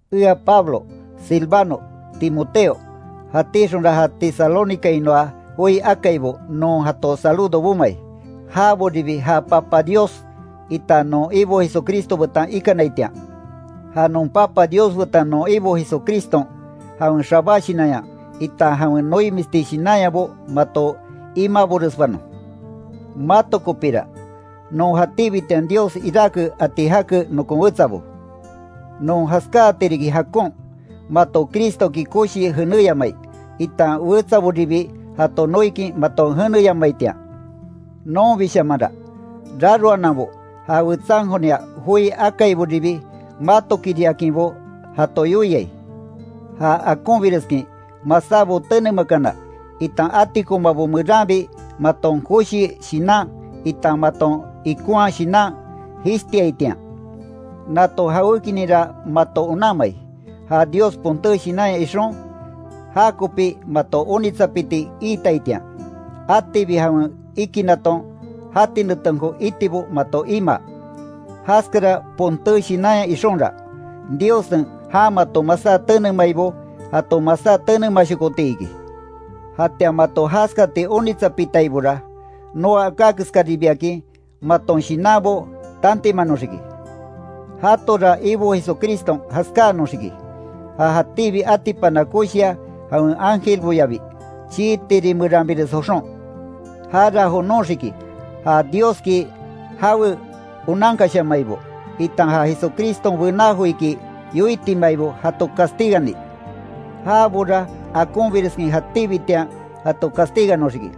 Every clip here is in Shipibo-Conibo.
Ea Pablo, Silvano, Timoteo, jatíxonra ja Tesalónicainoa joi akaibo, non jato saludo bomai, jaboribi ja Papa Dios, itan non Ibo Jesucristo betan ikanaitian. Ja non Papa Dios betan non Ibon Jesucriston, jawen xabá shinanya, itan jawen noimisti shinanyabo mato imaboresbanon. Mato kopira, non jatíbitian Dios iráke ati jake nokon wetsabo. Non jaskáati riki jakon, mato Cristoki koshii jenéyamai, itan wetsaboribi jato noikin maton jeneyamaitian. Nonbishamanra, raroananbo ja wetsankonia joi akaiboribi matokiriakinbo jato yoiai. Ja akonbireskin masábo tenemakana, itan atikomabo meranbi maton koshi shinan itan maton ikonhaa shinan, jishtiaitian. Nato jawékininra mato onanmai, ja Dios ponté shinanya ixon, jakopi mato onitsapiti iitaitian, atibi jawen ikinaton jati netenko itibo mato imaa. Jaskara ponté shinanya ixonra, Diossen jan mato masá tenemaibo jato masá tenemashokoti iki. Jatian mato jaskati onitsapitaibora, noa aká keskáribiakin maton shinanbo tantimanoxiki. Jatora Ibo Jesucriston jaskáanoxiki, ja jatíbi atipana koshia jawen ángelboyabi chii tiri meranbires joxon. Jara jonoxiki ja Dioski jawe onankashamaibo, itan ja Jesucriston bená joiki yoitimataibo jato castigani. Jabora akonbireskin jatíbitian jato castiganoxiki.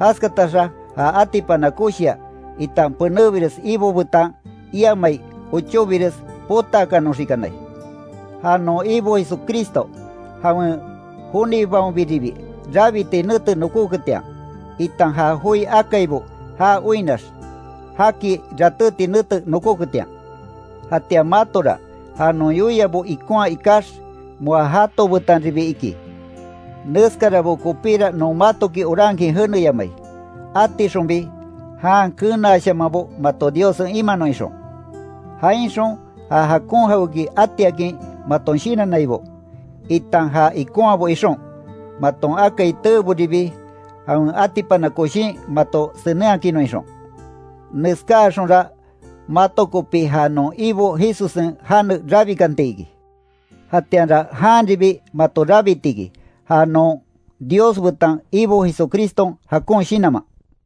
Jaskataxa ja atipana koshia, itan penébires Ibo betan iamai ochóbires potakaanoxikanai. Ja non Ibo Jesucristo jawen jonibaonbiribi rabiti nete nokóketian, itan ja joi akaibo já oinnax jaki ratéti nete nokóketian. Jatian matora ja non yoiabo ikonhaa ikax, moa jato betanribi iki. Neskarabo kopíra non matoki orankin jeneyamai, atixonbi jan kenaashamanbo mato Diossen imanon ixon. Jainxon ja jakon jawéki atiakin maton shinannaibo, itan ja ikonhaabo ixon maton akai teeboribi jawen atipana koshin mato senenhakinnon ixon. Neskaxonra mato kopi ja non Ibo Jesussen jane rabikanti iki. Jatianra janribi mato rabiti iki, ja non Dios betan Ibo Jesucriston jakon shinanman.